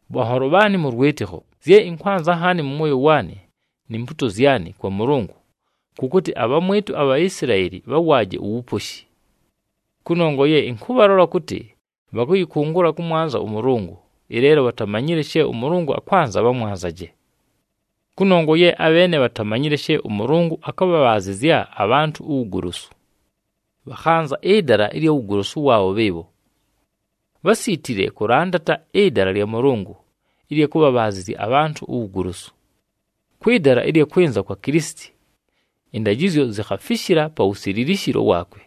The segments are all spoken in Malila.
Bhanholo bhaanɨ mʉ lwɨtɨkho, zye ɨnkwanza nhaani mʉ mwoyo waanɨ, ni mpuuto zyanɨ kwa Mʉlʉngʉ, kʉ kʉtɨ abhamwɨtʉ aBhaisilaeli bhawaaje uwuposhi. Kʉnongwa ye ɨnkʉbhalola kʉtɨ bhakʉyɨkʉngʉla kʉmwanza ʉMʉlʉngʉ, ɨleelo bhatamanyile she ʉMʉlʉngʉ akwanza bhamwanzaje. Kʉnongwa ye abheene bhatamanyile she ʉMʉlʉngʉ akʉbhabhaazɨzya abhantʉ uwugolosu, bhakhanza ɨdala ɨlya wugolosu waabho bhɨɨbho. Bhásiitile kʉlandata ɨdala lya Mʉlʉngʉ ɨlya kʉbhabhaazɨzya abhantʉ uwugolosu. Kwɨ dala ɨlya kwɨnza kwa Kilisiti, ɨndajɨzyo zikhafishila pa wusililishilo waakwe,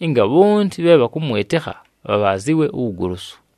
ɨnga bhonti bhe bhakʉmwɨtɨkha bhabhaazɨwe uwugolosu.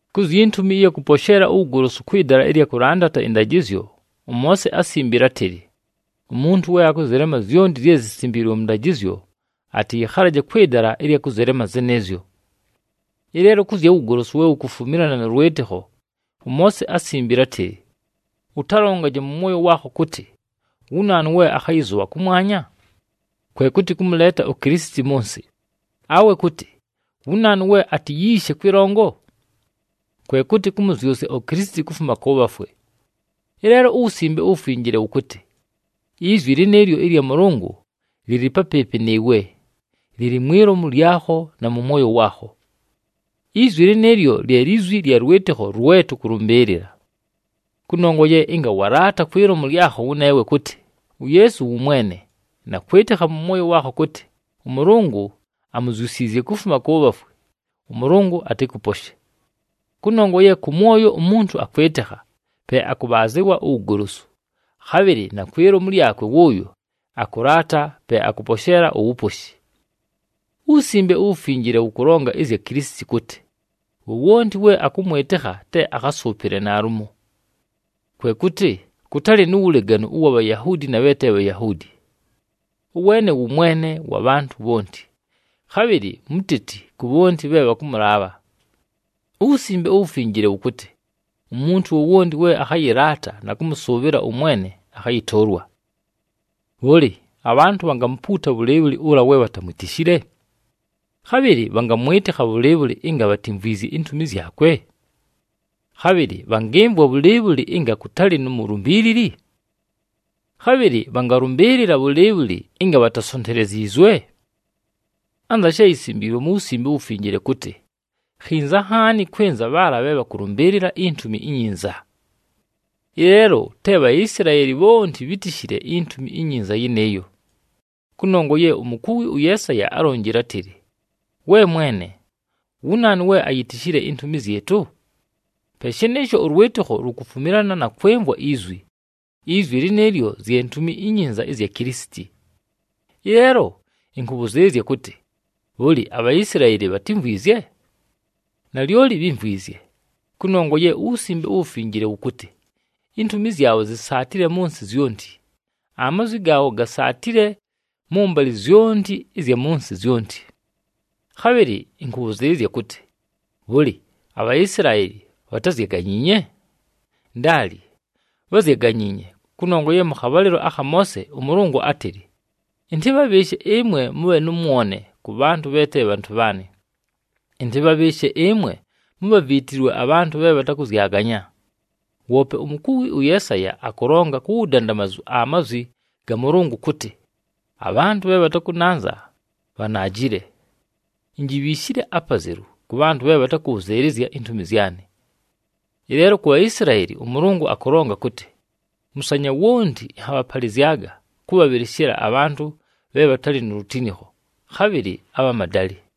Ku zyi ntumi ɨya kʉposheela uwugolosu kwɨ dala ɨlya kʉlandata ɨndajɨzyo, ʉMoose ásimbile átɨlɨ, “Umuntu we akʉzɨlema zyonti zye zisimbiilwe mʉ ndajɨzyo, atɨyɨkhalaje kwɨ dala ɨlya kʉzɨlema zɨnɨɨzyo.” Ɨleelo kʉ zya wugolosu we wukufumilana nʉ lwɨtɨkho, ʉMoose ásimbile átɨlɨ, “Ʉtalongaje mʉ mwoyo waakho kʉtɨ, ‘Wu naanu we akhayɨzʉbha kʉmwanya?’” Kwe kʉtɨ, kʉmʉleeta uKilisiti mʉ nsɨ. “Awe kʉtɨ, ‘Wu naanu we atiyiishe kwɨlongo?’” Kwe kʉtɨ, kʉmʉzyʉsya uKilisiti kufuma kʉ bhafwe. Ɨleelo uWusimbe uWufinjile wʉkʉtɨ, “Izwi lɨnɨɨlyo ɨlya Mʉlʉngʉ lɨlɨ papɨɨpɨ nɨɨwe, lɨlɨ mwi lomu lyakho na mʉ mwoyo waakho.” Izwi lɨnɨɨlyo lye lizwi lya lwɨtɨkho lwe tʉkʉlʉmbɨɨlɨla. Kʉnongwa ye ɨnga walaata kwi lomu lyakho wʉneewe kʉtɨ, “UYeesu wʉ Mwene,” na kwɨtɨkha mʉ mwoyo waakho kʉtɨ ʉMʉlʉngʉ amuzyusiizye kufuma kʉ bhafwe, ʉMʉlʉngʉ atɨkʉposhe. Kʉnongwa ye kʉ mwoyo umuntu akwɨtɨkha, pe akʉbhaazɨwa uwugolosu, khabhɨlɨ na kwi lomu lyakwe wʉʉyo akʉlaata, pe akʉposheela uwuposhi. UWusimbe uWufinjile wʉkʉlonga ɨzya Kilisiti kʉtɨ, “Wowonti we akʉmwɨtɨkha te akhasʉʉpɨle naalumo.” Kwe kʉtɨ kʉtalɨ nu wuleganu ʉwa Bhayahuudi na bhe te Bhayahuudi. Ʉweene wʉ Mwene wa bhantʉ bhonti, khabhɨlɨ muteti ku bhonti bhe bhakʉmʉlaabha. UWusimbe uWufinjile wʉkʉtɨ, “Umuntu wowonti we akhayɨlaata na kʉmʉsʉʉbhɨla ʉMwene akhayɨtʉʉlwa.” Bhʉlɨ, abhantʉ bhangamupuuta bhʉlɨɨbhʉlɨ ʉla we bhatamwitishile? Khabhɨlɨ bhangamwɨtɨkha bhʉlɨɨbhʉlɨ ɨnga bhatimvwizye intumi zyakwe? Khabhɨlɨ bhangɨmvwa bhʉlɨɨbhʉlɨ ɨnga kʉtalɨ nu mulumbiilili? Khabhɨlɨ bhangalʉmbɨɨlɨla bhʉlɨɨbhʉlɨ ɨnga bhatasonteleziizwe? Anza she yisimbiilwe mu Wusimbe uWufinjile kʉtɨ, “Khinza nhaani kwɨnza bhaala bhe bhakʉlʉmbɨɨlɨla iNtumi iNyinza!” Ɨleelo te Bhaisilaeli bhonti bhítishile iNtumi iNyinza yɨnɨɨyo. Kʉnongwa ye umukuwi ʉYeesaya álonjile átɨlɨ, “We Mwene, wu naanu we ayitishile intumi zyɨtʉ?” Pe shɨnɨɨsho, ʉlwɨtɨkho lukufumilana na kwɨmvwa izwi, izwi lɨnɨɨlyo zye Ntumi iNyinza ɨzya Kilisiti. Ɨleelo ɨnkʉbhʉzɨɨlɨzya kʉtɨ, bhʉlɨ, aBhaisilaeli bhatimvwizye? Nalyoli bhímvwizye, kʉnongwa ye uWusimbe uWufinjile wʉkʉtɨ, “Intumi zyabho zisaatile mʉ nsɨ zyonti, amazwi gaabho gasaatile mʉmbalɨ zyonti ɨzya mʉ nsɨ zyonti.” Khabhɨlɨ ɨnkʉbhʉzɨɨlɨzya kʉtɨ, bhʉlɨ, aBhaisilaeli bhatázyaganyiinye? Ndaali, bházyaganyiinye, kʉnongwa ye mʉ khabhalɨlo akha Moose ʉMʉlʉngʉ átɨlɨ, “Ɨntɨbhabhɨɨshe ɨmwe mʉbhe nʉ mwone kʉ bhantʉ bhe te bhantʉ bhaanɨ. Ɨntɨbhabhɨɨshe ɨmwe mubhaviitilwe, abhantʉ bhe bhatakʉzyaganya.” Woope umukuwi ʉYeesaya akʉlonga ku wudandamazu amazwi ga Mʉlʉngʉ kʉtɨ, “Abhantʉ bhe bhatakʉnanza, bhanaajile. Injibhiishile apazelu kʉ bhantʉ bhe bhatakʉbhʉzɨɨlɨzya intumi zyanɨ.” Ɨleelo kʉ zya Bhaisilaeli, ʉMʉlʉngʉ akʉlonga kʉtɨ, “Mʉsanya wonti ɨnhabhapalɨzyaga kʉbhabhɨlɨshɨla abhantʉ bhe bhatalɨ nu lutinikho, khabhɨlɨ abha madalɨ.”